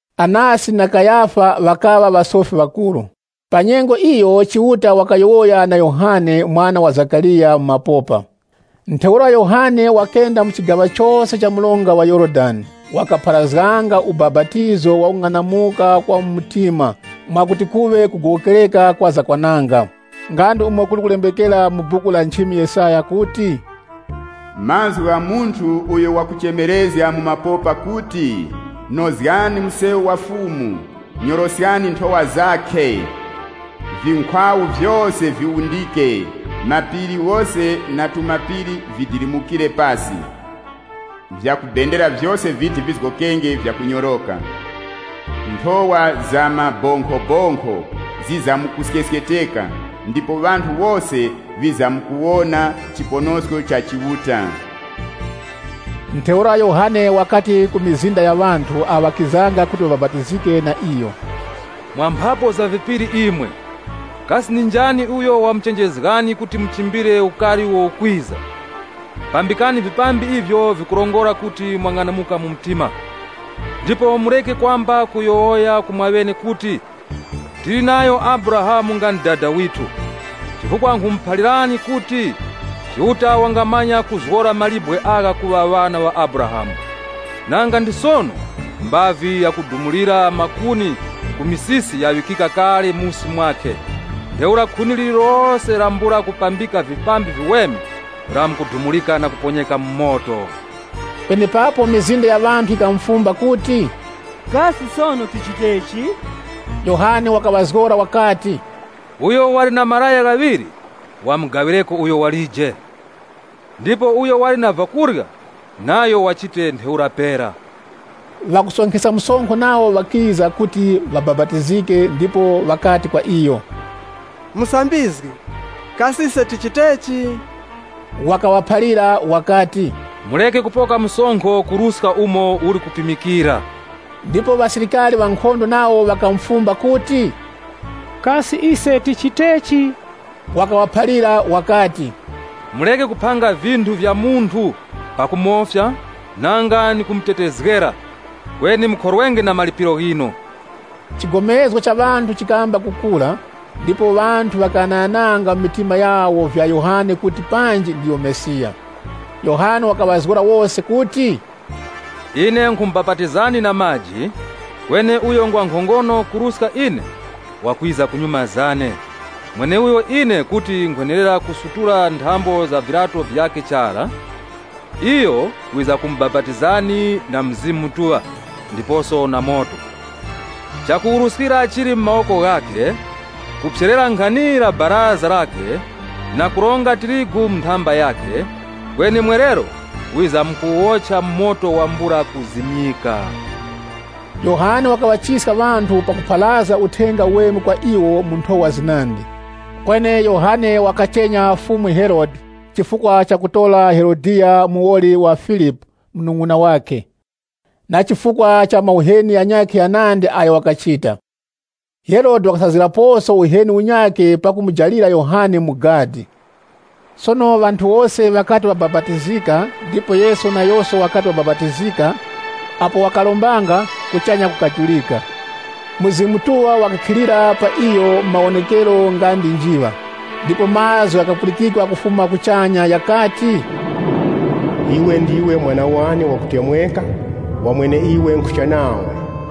Anasi na Kayafa ŵakaŵa ŵasofi ŵakuru. Pa nyengo iyo Chiuta wakayowoya na Yohane, mwana wa Zakariya, mu mapopa. Ntheura Yohane wakenda mu chigaŵa chose cha mronga wa Yorodani, wakapharazganga ubapatizo wa kung'anamuka kwa mu mtima mwakuti kuŵe kugowokereka kwa zakwananga. Nga ndi umo kuli kulembekera mu Buku la nchimi Yesaya kuti, “Mazgu gha munthu uyo wakuchemerezga mu mapopa kuti, ‘Nozgani msewu wa Fumu, Nyoroskani nthowa zakhe. (LXX) Vinkhwawu vyose viwundike, mapiri ghose na tumapiri vidilimukire pasi. Vyakubendera vyose viti vizgokenge vyakunyoroka, nthowa za mabonkhobonkho zizamkuskesketeka, Ndipo ŵanthu wose ŵizamkuwona chiponosko cha Chiuta.’” Ntheura Yohane wakati ku mizinda ya ŵanthu awo ŵakizanga kuti ŵabapatizike na iyo, “Mwa mphapu za vipiri imwe, kasi ndi njani uyo wamuchenjezgani kuti muchimbire ukari uwo ukwiza? Pambikani vipambi ivyo vikurongora kuti mwang'anamuka mu mtima. Ndipo mureke kwamba kuyowoya ku mwaŵene kuti, ‘Tili nayo Abrahamu nga ndi dada withu,’ chifukwa nkhumuphalirani kuti, Chiuta wangamanya kuzgora mawe agha kuŵa ŵana ŵa Abrahamu. Nanga ndi sono mbavi yakudumulira makuni ku misisi yaŵikika kale musi mwakhe ntheura khuni lirilose lambula kupambika vipambi viweme lamkudumurika na kuponyeka mu moto.” Penepapo mizinda ya ŵanthu yikamufumba kuti, “Kasi sono tichitechi?” Yohane wakaŵazgora wakati, “Uyo wali na malaya ghaŵiri, wamugaŵireko uyo walije, ndipo uyo wali na vyakurya, nayo wachite ntheura pera.” Ŵakusonkheska msonkho nawo ŵakiza kuti ŵabapatizike ndipo ŵakati kwa iyo, “Musambizgi, kasi ise tichitechi?” Wakaŵaphalira wakati, “Mureke kupoka msonkho kuruska umo uli kupimikira.” Ndipo ŵasilikari nawo ŵakamufumba kuti, “Kasi ise tichitechi?” Wakaŵaphalira wakati, “Mureke kuphanga vinthu vya munthu pakumofya, nanga ndi kumutetezgera. Kweni mukhorwenge na malipiro ghinu.” Chigomezgo cha ŵanthu chikamba kukura, ndipo ŵanthu ŵakagomezganga na kughanaghana mu mitima yawo vya Yohane kuti panji ndiyo Mesiya. Yohane wakaŵazgora wose kuti, “Ine nkhumubapatizani na maji, kweni uyo ngwa nkhongono kuruska ine wakwiza kunyuma zane, mweneuyo ine kuti nkhwenerera kusutula nthambo za viryato vyakhe chara. Iyo wizamkumubapatizani na Mzimu Mutuŵa, ndiposo na moto. Chakuwuruskira chili mu mawoko ghakhe, kuti waphyere luwugha lwakhe na kuronga tirigu mu nthamba yakhe, kweni mwerero wizamkuwuwocha mu moto wambula mazimyiko.” Yohane wakaŵachiska ŵanthu pakupharazga Uthenga Uweme kwa iwo mu nthowa zinandi. Kweni Yohane wakachenya Fumu Herode, chifukwa chakutora Herodiya muwoli wa Filipu munung'una wakhe, na chifukwa cha mauheni ghanyakhe ghanandi agho wakachita. Herode wakasazgiraposo uheni unyakhe pakumujalira Yohane mu gadi. Sono ŵanthu wose ŵakati ŵabapatizika, ndipo Yesu nayoso wakati wakabapatizika, apo wakarombanga, kuchanya kukajurika. Mzimu Mutuŵa wakakhilira pa iyo mu mawonekero nga ndi njiŵa. Ndipo mazgu ghakapulikikwa kufuma kuchanya ghakati, “Iwe ndiwe Mwana wane wakutemweka, wa mweneiwe nkhucha nawe.”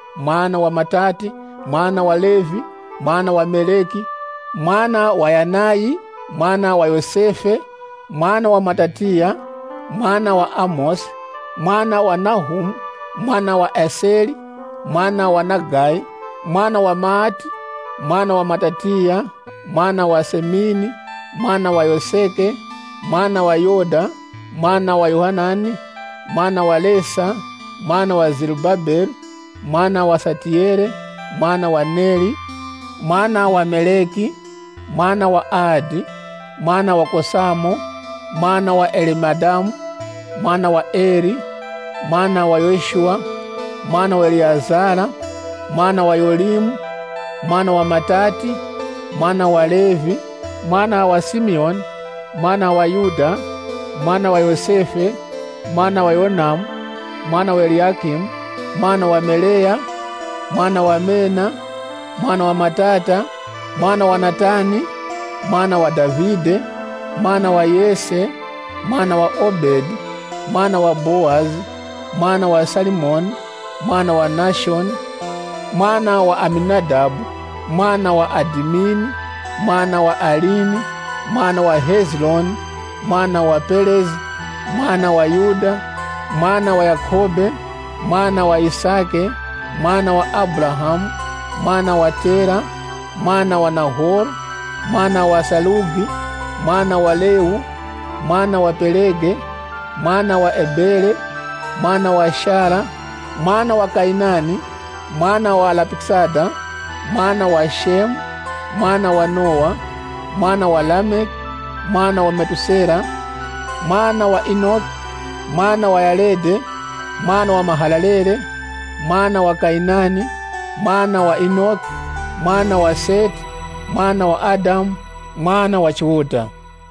mwana wa Matati, mwana wa Levi, mwana wa Meleki, mwana wa Yanayi, mwana wa Yosefe, mwana wa Matatiya, mwana wa Amosi, mwana wa Nahumu, mwana wa Eseri, mwana wa Nagayi, mwana wa Maati, mwana wa Matatiya, mwana wa Semini, mwana wa Yoseki, mwana wa Yoda, mwana wa Yohanani, mwana wa Resa, mwana wa Zerubabele, mwana wa Satiyele, mwana wa Neri, mwana wa Meleki, mwana wa Adi, mwana wa Kosamo, mwana wa Elemadamu, mwana wa Eri, mwana wa Yoshuwa, mwana wa Eliyezere, mwana wa Yorimu, mwana wa Matati, mwana wa Levi, mwana wa Simiyoni, mwana wa Yuda, mwana wa Yosefe, mwana wa Yonamu, mwana wa Eliyakimu, mwana wa Meleya, mwana wa Mena, mwana wa Matata, mwana wa Natani, mwana wa Davide, mwana wa Yese, mwana wa Obedi, mwana wa Bowazi, mwana wa Salimoni, mwana wa Nashoni, mwana wa Aminadabu, mwana wa Adimini, mwana wa Arini, mwana wa Hezironi, mwana wa Perezi, mwana wa Yuda, mwana wa Yakhobe, mwana wa Yisake, mwana wa Abrahamu, mwana wa Tera, mwana wa Nahoro, mwana wa Sarugi, mwana wa Rewu, mwana wa Pelegi, mwana wa Ebere, mwana wa Shela, mwana wa Kayinani, mwana wa Arifakisadi, mwana wa Shemu, mwana wa Nowa, mwana wa Lameki, mwana wa Methusela, mwana wa Enoki, mwana wa Yaredi, mwana wa Mahalalele, mwana wa Kayinani, mwana wa Enoshi, mwana wa Seti, mwana wa Adamu, mwana wa Chiuta.